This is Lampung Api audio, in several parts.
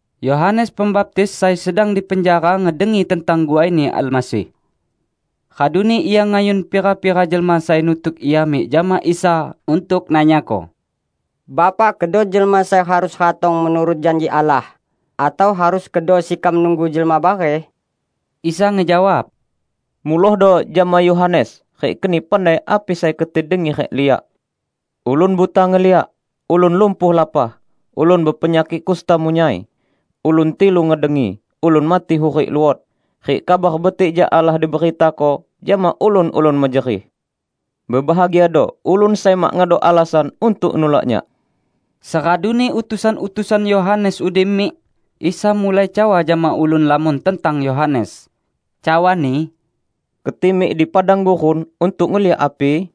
Yohanes Pembaptis sai sedang di penjara ngedengi tentang guaini Almasih. Raduni ia ngayun pira-pira jelma sai nutuk ia mik jama Isa untuk nanyako, "Bapak kedo jelma sai harus ratong menurut janji Allah, atau harus kedo sekam nunggu jelma bareh?" Isa ngejawab, "Mulohdo jama Yohanes rik keni pandai api sai keti dengi rik liak: Ulun buta ngeliak, ulun lumpuh lapah, ulun bepenyakik kusta munyai; ulun tilu ngedengi, ulun mati hurik luot, rik Kabar Betik jak Allah diberitako jama ulun-ulun mejerih. Bebahagiado ulun sai mak ngedok alasan untuk nulak Nyak!" Seraduni utusan-utusan Yohanes udi mik, Isa mulai cawa jama ulun lamon tentang Yohanes, cawa-Ni, "Keti mik di padang gurun untuk ngeliak api?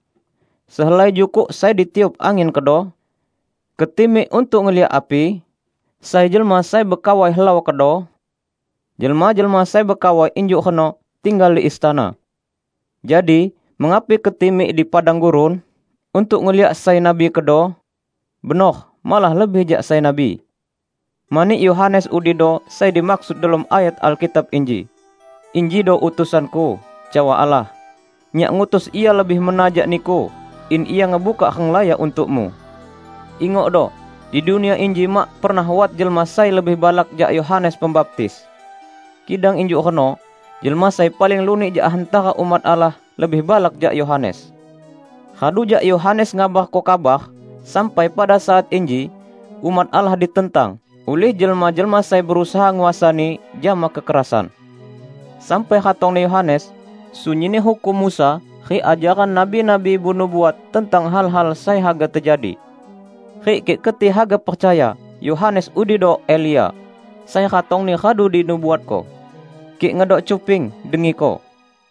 Sehelai jukuk sai ditiup angin kedo? Keti mik untuk ngeliak api? Sai jelma sai bekawai helau kedo? Jelma-jelma sai bekawai injuk reno tinggal di istana! Jadi mengapi keti mik di padang gurun? Untuk ngeliak sai nabi kedo? Benor, malah lebih jak sai nabi. Mani Yohanes udido sai dimaksud delom ayat Alkitab inji, 'Injido utusan-Ku, cawa Allah, Nyak ngutus ia lebih mena jak Niku in ia ngebukak renglaya untuk-Mu.' Ingokdo! Di dunia inji mak pernah wat jelma sai lebih balak jak Yohanes Pembaptis. Kidang injuk reno, jelma sai paling lunik jak hantara umat Allah lebih balak jak Yohanes. Radu jak Yohanes ngabarko kabar sampai pada saat inji, umat Allah ditentang ulih jelma-jelma sai berusaha nguasani jama kekerasan. Sampai ratongni Yohanes, sunyinni hukum Musa rik ajaran nabi-nabi benubuat tentang hal-hal sai haga tejadi. Rik kik keti haga percaya, Yohanes udido Elia, sai ratongni radu dinubuatko. Kik ngedok cuping, dengiko!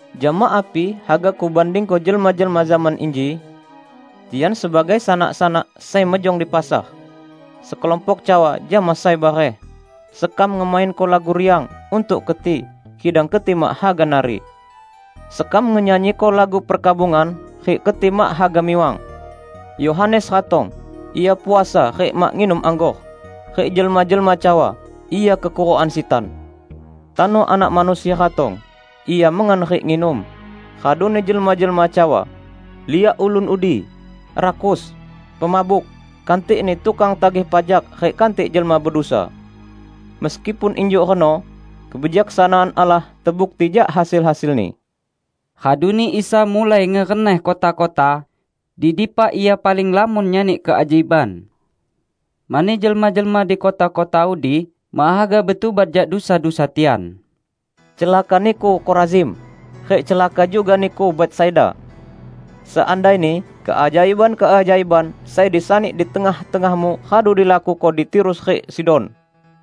Jama api haga Kubandingko jelma-jelma zaman inji? Tian sebagai sanak-sanak sai mejong di pasar. Sekelompok cawa jama sai bareh, 'Sekam ngemainko lagu riang untuk keti, kidang keti mak haga nari! Sekam ngenyanyiko lagu perkabungan, rik keti mak haga miwang!' Yohanes ratong -- ia puasa rik mak nginum anggor; rik jelma-jelma cawa, 'Ia kekurukan sitan!' Tano Anak Manusia ratong -- Ia mengan rik nginum; raduni jelma-jelma cawa, 'Liak ulun udi! Rakus, pemabuk, kantikni tukang tagih pajak rik kantik jelma bedusa.' Meskipun injuk reno, kebijaksanaan Allah tebukti jak hasil-hasilni." Raduni Isa mulai ngereneh kota-kota, di dipa Ia paling lamon nyani keajaiban. Mani jelma-jelma di kota-kota udi mak haga betubat jak dusa-dusa tian. "Celaka niku, Korazim! Rik celaka juga niku, Betsaida! Seandaini keajaiban-keajaiban sai disani di tengah-tengahmu radu dilakuko di Tirus rik Sidon,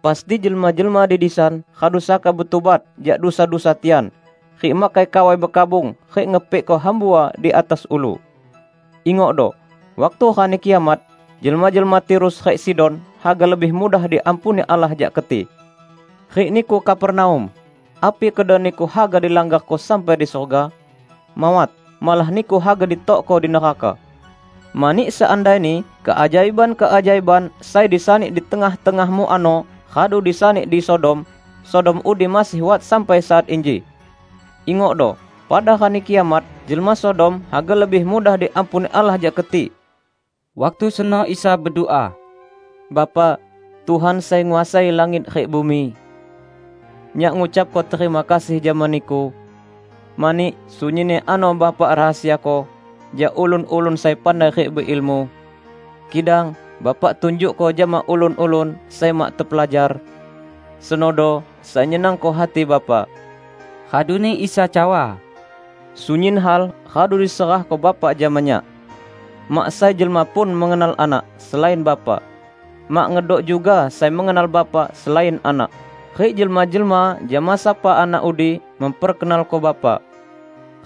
pasti jelma-jelma di disan radu saka betubat jak dusa-dusa tian rik makai kawai bekabung rik ngepikko hambua di atas ulu. Ingokdo, waktu Rani Kiamat, jelma-jelma Tirus rik Sidon haga lebih mudah diampuni Allah jak keti! Rik niku, Kapernaum! Api kedo niku haga dilanggarko sampai di surga? Mawat! Malah niku haga ditokko di neraka! Mani seandaini keajaiban-keajaiban sai disani di tengah-tengahmu ano radu disani di Sodom, Sodom udi masih wat sampai saat inji! Ingokdo, pada Rani Kiamat, jelma Sodom haga lebih mudah diampuni Allah jak keti!" Waktu seno Isa bedua, "Bapa, Tuhan sai nguasai langit rik bumi! Nyak ngucapko terima kasih jama Niku mani sunyinni ano Bapa rahasiako jak ulun-ulun sai pandai rik beilmu, kidang Bapa tunjukko jama ulun-ulun sai mak tepelajar. Senodo sai nyenangko hati Bapa." Raduni Isa cawa, "Sunyin hal radu diserahko Bapa jama Nyak. Mak sai jelma pun mengenal Anak, selain Bapa. Mak ngedok juga sai mengenal Bapa selain Anak, rik jelma-jelma jama sapa Anak udi memperkenalko Bapa.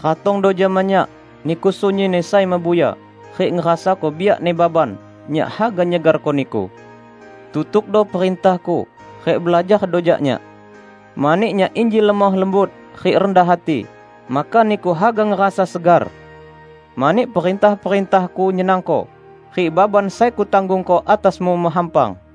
Ratongdo jama Nyak niku sunyinni sai mebuya, rik ngerasako biakni baban; Nyak haga nyegarko niku. Tutukdo perintah-Ku rik belajardo jak Nyak. Mani Nyak inji lemoh lembut rik rendah hati, maka niku haga ngerasa segar. Mani perintah-perintah-Ku nyenangko, rik baban sai Kutanggungko atasmu mehampang."